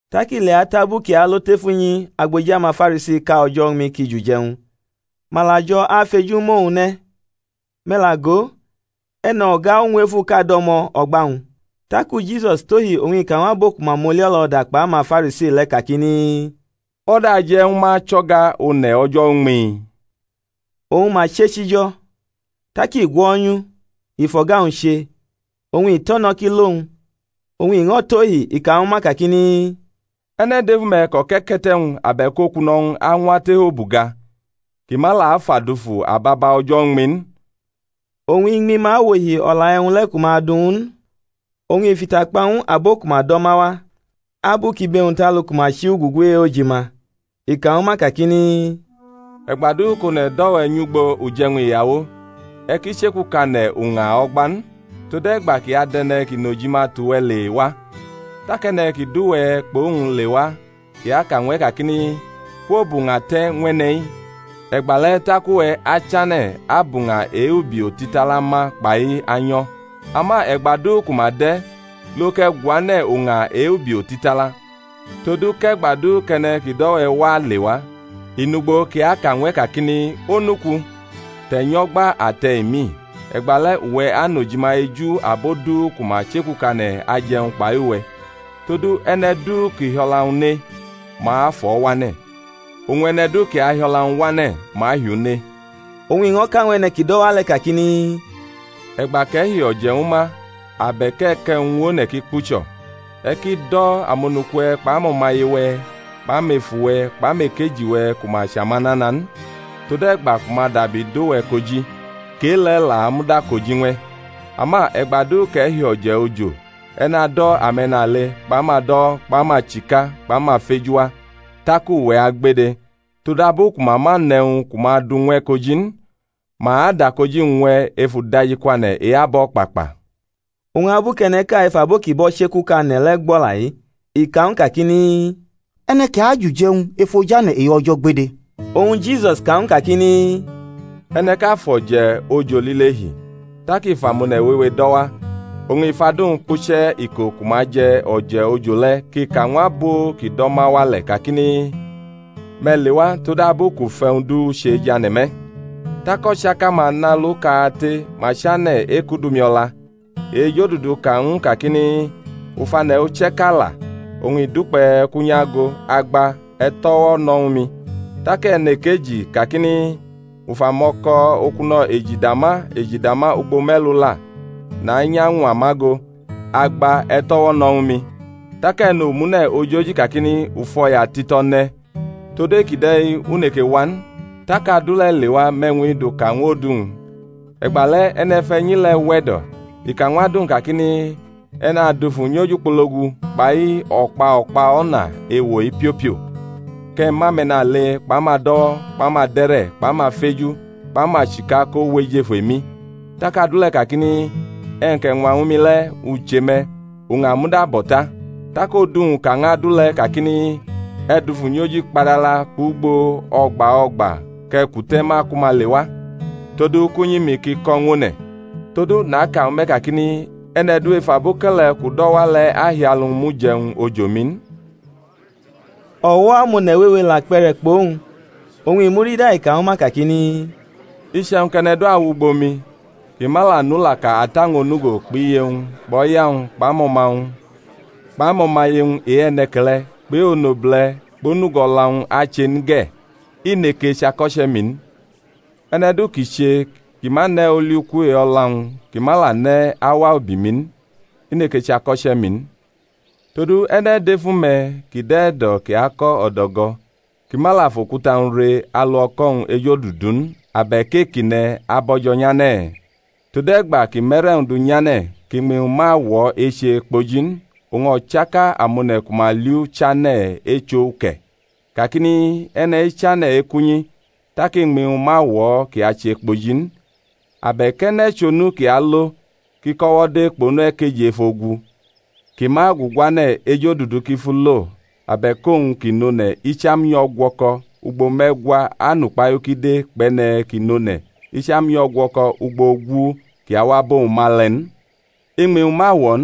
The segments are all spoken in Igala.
Tak ileatʼabu kʼi alo tef unyi agboji amaFarisiʼka o̩jo̩ uñmi kʼi jʼuje̩wñ, ma la jo̩ afʼeju mʼowñ ne̩. Me̩ la go, e̩no̩ga uñwefuʼka do̩mo̩ o̩gba-wñ. Taku Jisus tohi oñ i ka ñw abo ku ma mʼoli-o̩lo̩da kpʼamaFarisi le̩, kakini, O̩da aje̩ ñwu ma chʼo̩ga one̩ o̩jo̩ uñmi? Oñ ma chechi jo̩. Tak i gwo̩nyʼu, i fʼo̩ga-wñ che, oñ i tʼo̩ no̩ kʼi lo-wñ. Oñ i ño̩ tohi, i ka ñwu ma kakini, E̩ne̩ dʼefu me̩ kʼo̩ke̩ke̩te̩-wñ abe̩k okuno̩-wñ añwa tef obuga, kʼi ma la afa dufu ababa o̩jo̩ uñmi n? Oñ iñmi-ma wʼohi o̩la e̩wñ le̩ ku ma du ñw u n. Oñ i fʼita kpa ñw abo ku ma do̩ ma wa, abu kʼibe-wñ tʼalu ku ma chi ugugu e-ojima; i ka ñwu ma kakini, E̩gba du kʼone̩ do̩ we̩ nyʼugbo uje̩wñ iyawo, e̩ ki che̩kukane̩ uña o̩gba n, tode̩gba kʼi adʼe̩ne̩ kʼi nʼojima tʼuwe̩ le wa, tak e̩ne̩ ki do̩ uwe̩ kpʼowñ lewa kʼi aka ñw e̩ kakini, Kwobʼuña te̩ ñw e̩ne̩-i, e̩gbale̩ tak uwe̩ achane̩ abʼuña e-ubi otitala ma kpai anyo̩. Ama e̩gba du ku ma dʼe̩, lo kʼe̩ guane̩ uña e-ubi otitala: todu kʼe̩gba du kʼe̩ne̩ kʼi do̩ we̩ wa lewa, i nʼugbo kʼi aka ñw e̩ kakini, Onuku, te̩ nyʼo̩gba ate̩ emi; e̩gbale̩ uwe̩ anʼojima eju abo du ku ma che̩kukane̩ ajʼe̩wñ kpai uwe̩. Todu, e̩ne̩ du kʼi hi o̩la-wñ ne, ma afʼo̩ wane̩; oñ e̩ne̩ du kʼi ahi o̩la-wñ wane̩, ma ahi u ne. Oñ i ño̩ ka ñw e̩ne̩ ki dʼo̩ wa le̩ kakini, E̩gba kʼe̩ hi o̩je̩ ñwu ma, abe̩k e̩ kʼe̩wñ ñw one̩ kʼi kpucho̩, e̩ ki do̩ amonuku-we̩ kpʼamo̩maye-we̩ kpʼamefu-we̩ kpʼamekeji-we̩ ku ma chʼamanana n, tode̩gba ku ma dabi do̩ we̩ koji, kʼe-le̩ la amud akoji-wñ ñw e̩. Ama e̩gba du kʼe̩ hi o̩je̩ ojo e̩ nado̩ ame̩nale kpʼamado̩wo̩ kpʼamachika kpʼamafeju wa, tak uwe̩ agbede, todabu ku ma ma nʼe̩wñ ku ma du ñw e̩ koji n; ma adʼakoji-wñ ñw e̩ ef udajikwane̩ e-abo̩kpakpa. Oñ abu kʼe̩ne̩ʼka ef abo ki bʼo̩ chekukane̩ le̩ gbo̩ o̩la-i, i ka ñw u kakini, E̩ne̩ kʼi ajʼuje̩wñ ef ojane̩ e-O̩jo̩ agbede! Oñ Jisus ka ñw u kakini, E̩ne̩ʼka fʼo̩je̩ ojo lile hi, tak i fʼamone̩ wewe do̩ wa; oñ i fʼadu-wñ kpuche̩ iko ku ma je̩ o̩je̩ ojo le̩ kʼi ka ñw abo kʼi do̩ ma wa le̩ kakini, Me̩ lewa; todabu kʼu fʼe̩wñ du che jʼane̩ me̩. Tak o̩chaka-ma nʼalu kate, ma chane̩ ekʼudʼumi o̩la. E-ejodudu ka ñw u kakini, U fʼane̩ uche̩ʼka la, oñ i dukpe̩ kʼu nyʼagʼo; agba, e̩ tʼo̩wo̩ no̩ ñwu mi. Tak e̩nekeji kakini, U fʼamo̩ko̩ okuno̩ eji dama eji dama ugbo me̩lu la, nanyʼañwa ma go; agba, e̩ tʼo̩wo̩ no̩ ñwu mi. Tak e̩nomune̩ ojoji kakini, U fʼo̩ya tito̩ ne̩, tod e-kide̩ u neke wa n. Tak adu le̩ lewa mʼe̩wñ-i duka ñw odu-wñ. E̩gbale̩ e̩ne̩fe̩nyi le̩ we̩do̩ i ka ñw adu-wñ kakini, E̩ nadufu nyʼojukpologu kpai o̩kpa o̩kpa o̩na ewo-i piopio kʼe̩ mʼame̩nale kpʼamado̩wo̩ kpʼamade̩re̩ kpʼamafeju kpʼamachika ko wʼejefu emi. Tak adu le̩ kakini, E̩wñ kʼe̩ ñwa ñwu mi le̩, u che me̩, uña muda bo̩ ta. Tak odu-wñ ka ñw adu le̩ kakini, E̩ dufu nyʼojikpadala kpʼugbo o̩gba o̩gba, kʼe̩ kute̩ ma ku ma lewa, todu kʼunyi-mi ki ko̩ ñw one̩. Todu naka ñwu me̩ kakini, E̩ne̩ du ef aboke̩le̩ kʼu do̩ wa le̩ ahi alu mʼuje̩wñ ojo-mi n. Ako̩che̩ Jisus eche chʼekpuna! O̩wo̩ amone̩ wewe la kpe̩re̩ kpʼowñ; oñ i murida i ka ñwu ma kakini, Iche̩wñ kʼe̩ne̩ du awʼugbo mi, kʼi ma la nʼulaka ata-wñ onugo kpʼiye-wñ kpʼo̩ya-wñ kpʼamo̩ma-wñ kpʼamo̩maye-wñ e-e̩ne̩ke̩le̩ kpʼe-onobule̩ kpʼonugo o̩la-wñ ache n ge̩, i neke chʼako̩che̩-mi n. E̩ne̩ du ki che kʼi ma ne̩ oli-uku e-o̩la-wñ, kʼi ma la ne̩ awa ubi-mi n, i neke chʼako̩che̩-mi n. Todu e̩ne̩ dʼefu me̩, kʼi dʼe̩ e̩do̩ kʼi ako̩ o̩do̩go̩, kʼi ma la fʼokuta-wñ re alu o̩ko̩-wñ ejodudu n abe̩k e-kʼi ne̩ abo̩jo̩ nyane̩? Tode̩gba kʼi mʼe̩re̩-wñ du nyane̩ kʼiñmi-wñ ma wo̩ eche kpoji n, oñ o̩chaka amone̩ ku ma li u chane̩ echʼo uke̩, kakini, E̩ne̩-i chane̩ ekʼunyi, tak iñmi-wñ ma wo̩ kʼi ache kpoji n. Abe̩k e̩ne̩ chʼonu kʼi alo kʼi kʼo̩wo̩ de kpʼonu ekeji ef ogu, kʼi ma aguguane̩ ejodudu kʼi fʼu lo abe̩k owñ kʼi nʼone̩ icham nyʼo̩gwo̩ko̩ ugbo me̩gwa anʼukpahiu kʼi de kpʼe̩ne̩ kʼi nʼone̩ icham nyʼo̩gwo̩ko̩ ugbo ogu kʼi awa abʼowñ ma le̩ n? Iñmi-wñ ma wo̩ n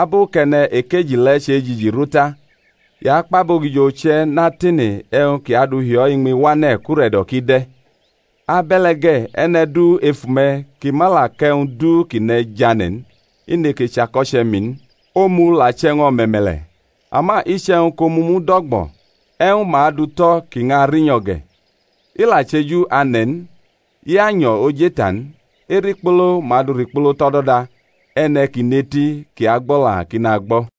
abu kʼe̩ne̩ ekeji le̩ chejiji rʼu ta, i akpʼabogijo uche̩ natene e̩wñ kʼi adu hi o̩ iñmi wane̩ kʼure̩do̩ ki de̩. Abe̩le̩ ge̩, e̩ne̩ du efu-me̩, kʼi ma la kʼe̩wñ du kʼi ne̩ jane̩ n, i neke chʼako̩che̩-mi n. Omu la chʼe̩wñ o̩me̩me̩le̩: ama iche̩wñ kʼomu mud o̩gbo̩, e̩wñ ma adu tʼo̩ kʼi ñʼarinyo̩ ge̩? I la chʼeju ane̩ n i anyo̩ ojeita n; erikpolo ma du rikpolo tʼo̩do̩da. E̩ne̩ ki nʼeti kʼi agbo̩la, kʼi nagbo̩.